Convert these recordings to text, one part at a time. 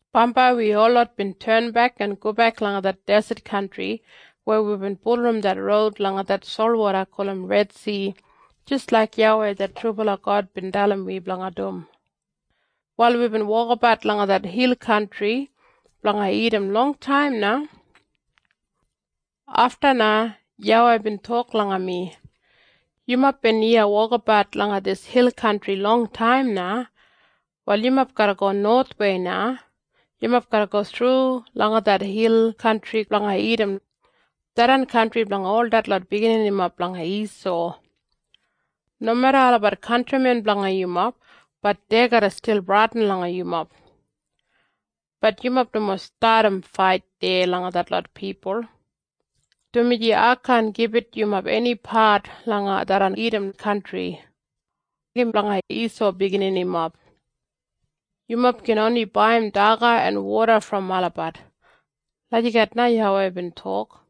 Bambai wi holot bin tenbek en gobek langa det deset kantri, weya wibin bulurrum det roud langa det solwoda gulum Redsi jis laik YAWEI det trubala God bin dalim wi blanga dum. Wal wibin wokabat langa det hil kantri blanga Idam longtaim na. “Afta na YAWEI bin tok langa mi, ‘Yumob bin iya wokabat langa dis hil kantri longtaim na. Wal yumob garra go nowathwei na. Yumob garra go thru langa det hil kantri blanga Idam, tharran kantri blanga ol detlot bigininimob blanga Isau. Nomeda olabat kantrimen blanga yumob, bat dei garra stil bradin langa yumob. Bat yumob nomo stadim fait deya langa detlot pipul, dumaji ai kaan gibit yumob eni pat langa tharran Idam kantri. Im blanga Isau bigininimob. Yumob gin oni baiyim daga en woda brom olabat.’ Lagijat na YAWEI bin tok.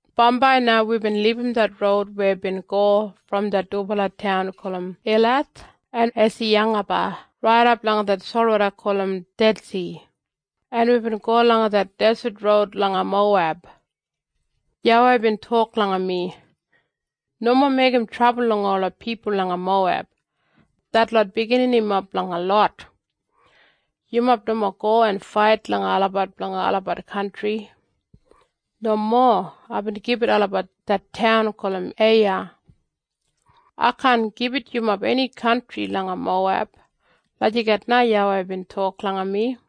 “Bambai na wibin libum det roud weya bin go brom det dubala taun gulum Elath en Esiyangeba raidap langa det solwoda gulum Dedsi, en wibin go langa det deset roud langa Moweb. YAWEI bin tok langa mi, ‘Nomo meigim trabul langa ola pipul langa Moweb. Detlot bigininimob blanga Lot. Yumob nomo go en fait langa olabat blanga olabat kantri. Nomo. Aibin gibit olabat det taun gulum Eiya. Ai kaan gibit yumob eni kantri langa Moweb.’” Lagijat na YAWEI bin tok langa mi.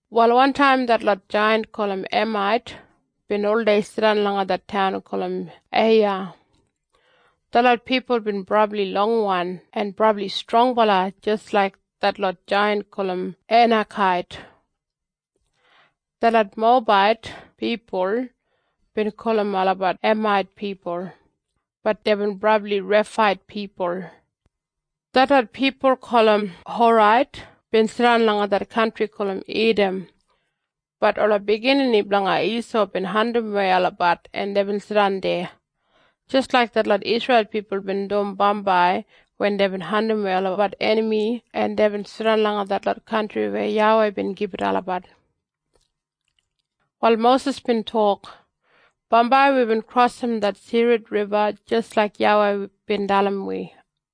Wal wantaim detlot jaiyant gulum Emait bin oldei jidan langa det taun gulum Eiya. Detlot pipul bin brabli longwan en brabli strongbala jis laik detlot jaiyant gulum Einakait. Detlot Mowebait pipul bin gulum olabat Emait pipul, bat deibin brabli Refait pipul. Detlot pipul gulum Horait bin jidan langa det kantri gulum Idam, bat ola biginini blanga Isau bin andimwei olabat en deibin jidan deya, jis laik detlot Isreil pipul bin dum bambai wen deibin andimwei olabat enami en deibin jidan langa detlot kantri weya YAWEI bin gibit olabat. Wal Mosis bin tok, “Bambai wibin krosim det Sered Riba jis laik YAWEI bin dalim wi.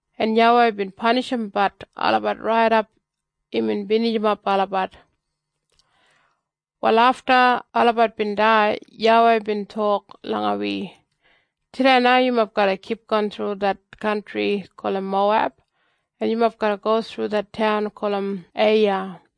En YAWEI bin panishimbat olabat raidap imbin binijimap olabat. “Wal afta olabat bin dai, YAWEI bin tok langa wi, ‘Tudei na yumob garra kipgon thru det kantri gulum Moweb, en yumob garra go thru det taun gulum Eiya.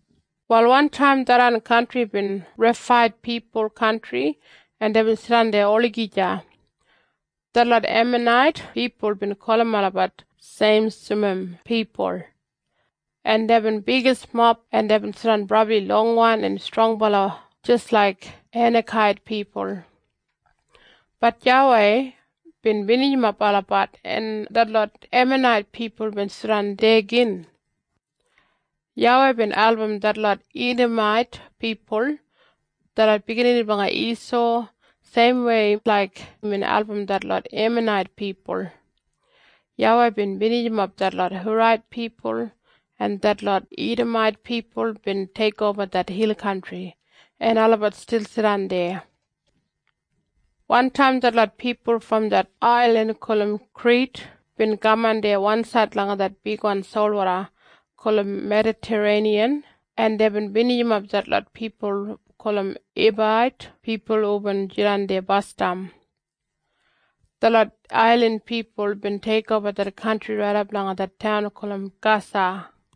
Wal wantaim tharran kantri bin Refait pipul kantri en deibin jidan deya olagija. Detlot Emanait pipul bin gulum olabat Seimsumim pipul. En deibin bigismob en deibin jidan brabli longwan en strongbala jis laik Einakait pipul. Bat YAWEI bin binijimap olabat en detlot Emanait pipul bin jidan deya gin. YAWEI bin album detlot Idamait pipul, detlot biginini blanga Isau, seimwei laik imbin album detlot Emanait pipul. YAWEI bin binijimap detlot Horait pipul, en detlot Idamait pipul bin teikoba det hil kantri, en olabat stil jidan deya. Wantaim detlot pipul brom det ailin gulum Krit bin kaman deya wansaid langa det bigwan solwoda gulum Medatareiniyan en deibin binijimap detlot pipul gulum Eibait pipul hubin jidan deya basdam. Detlot ailin pipul bin teikoba det kantri raidap langa det taun gulum Gasa.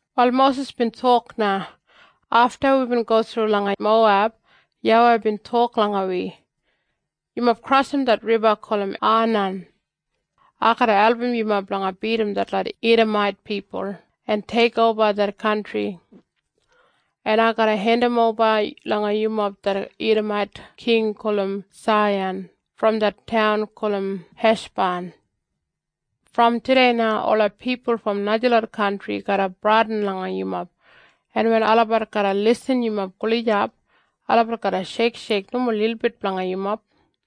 Wal Mosis bin tok na, “Afta wibin go thru langa Moweb YAWEI bin tok langa wi, ‘Yumob krosim det riba gulum Anan. Ai garra album yumob blanga bidim detlot Idamait pipul en teikoba det kantri. En ai garra hendimoba langa yumob det Idamait king gulum Saihan brom det taun gulum Heshban. Brom tudei na, ola pipul brom najalot kantri garra bradin langa yumob. En wen olabat garra irrim yumob gulijap, olabat garra sheiksheik nomo lilbit blanga yumob.’”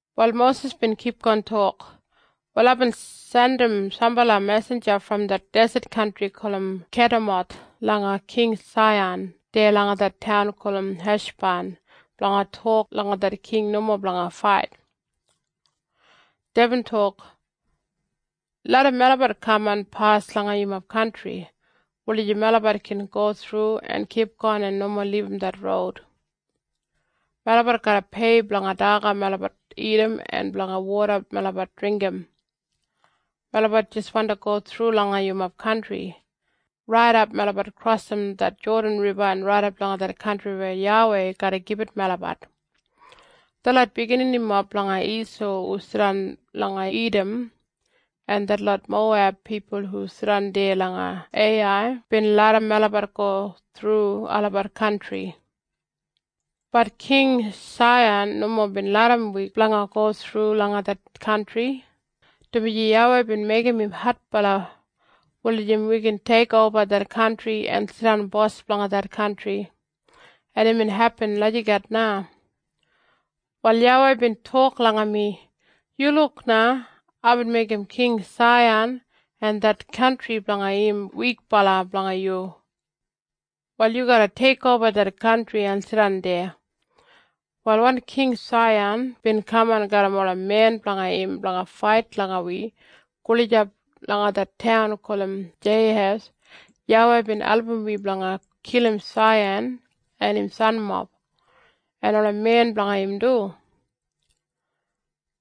Wal Mosis bin kipgon tok, “Wal aibin jandim sambala mesinja brom det deset kantri gulum Kedemoth langa King Saihan deya langa det taun gulum Heshban blanga tok langa det king nomo blanga fait. Deibin tok, ‘Larram melabat kaman pas langa yumob kantri, wulijim melabat gin go thru en kipgon en nomo libum det roud. Melabat garra pei blanga daga melabat dagat en blanga woda melabat dringgim. Melabat jis wandi go thru langa yumob kantri, raidap melabat krosim det Jodan Riba en raidap langa det kantri weya YAWEI garra gibit melabat. Detlot bigininimob blanga Isau hu jidan langa Idam, en detlot Moweb pipul hu jidan deya langa Eiyai bin larram melabat go thru olabat kantri.’ “Bat King Saihan nomo bin larram wi blanga go thru langa det kantri, dumaji YAWEI bin meigim im adbala wulijim wi gin teikoba det kantri en jidan bos blanga det kantri. En imbin hepin lagijat na. “Wal YAWEI bin tok langa mi, ‘Yu luk na. Aibin meigim King Saihan en det kantri blanga im wikbala blanga yu. Wal yu garra teikoba det kantri en jidan deya.’ Wal wen King Saihan bin kaman garram ola men blanga im blanga fait langa wi gulijap langa det taun gulum Jeihas, YAWEI bin album wi blanga kilim Saihan en im sanmob, en ola men blanga im du.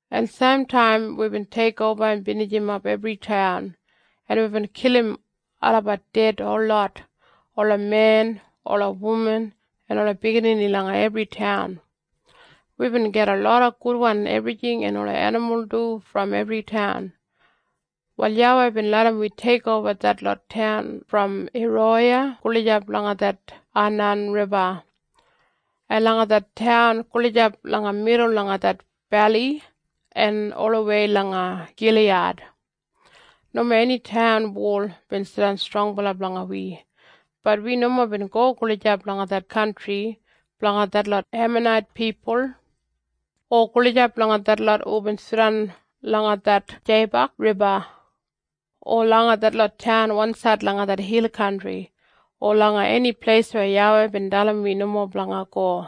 En seimtaim wibin teikoba en binijimap ebri taun, en wibin kilim olabat ded holot, ola men, ola wuman, en ola biginini langa ebri taun. Wibin gajim loda gudwan ebrijing en ola enimul du brom ebri taun. Wal YAWEI bin larram wi teikoba detlot taun brom Eroya gulijap langa det Anan Riba, en langa det taun gulijap langa midul langa det beli, en olawei langa Giliyad. Nomo eni taun wol bin jidan strongbala blanga wi. Bat wi nomo bin go gulijap langa det kantri blanga detlot Emanait pipul, o gulijap langa detlot hubin jidan langa det Jeibak Riba, o langa detlot taun wansaid langa det hil kantri, o langa eni pleis weya YAWEI bin dalim wi nomo blanga go.”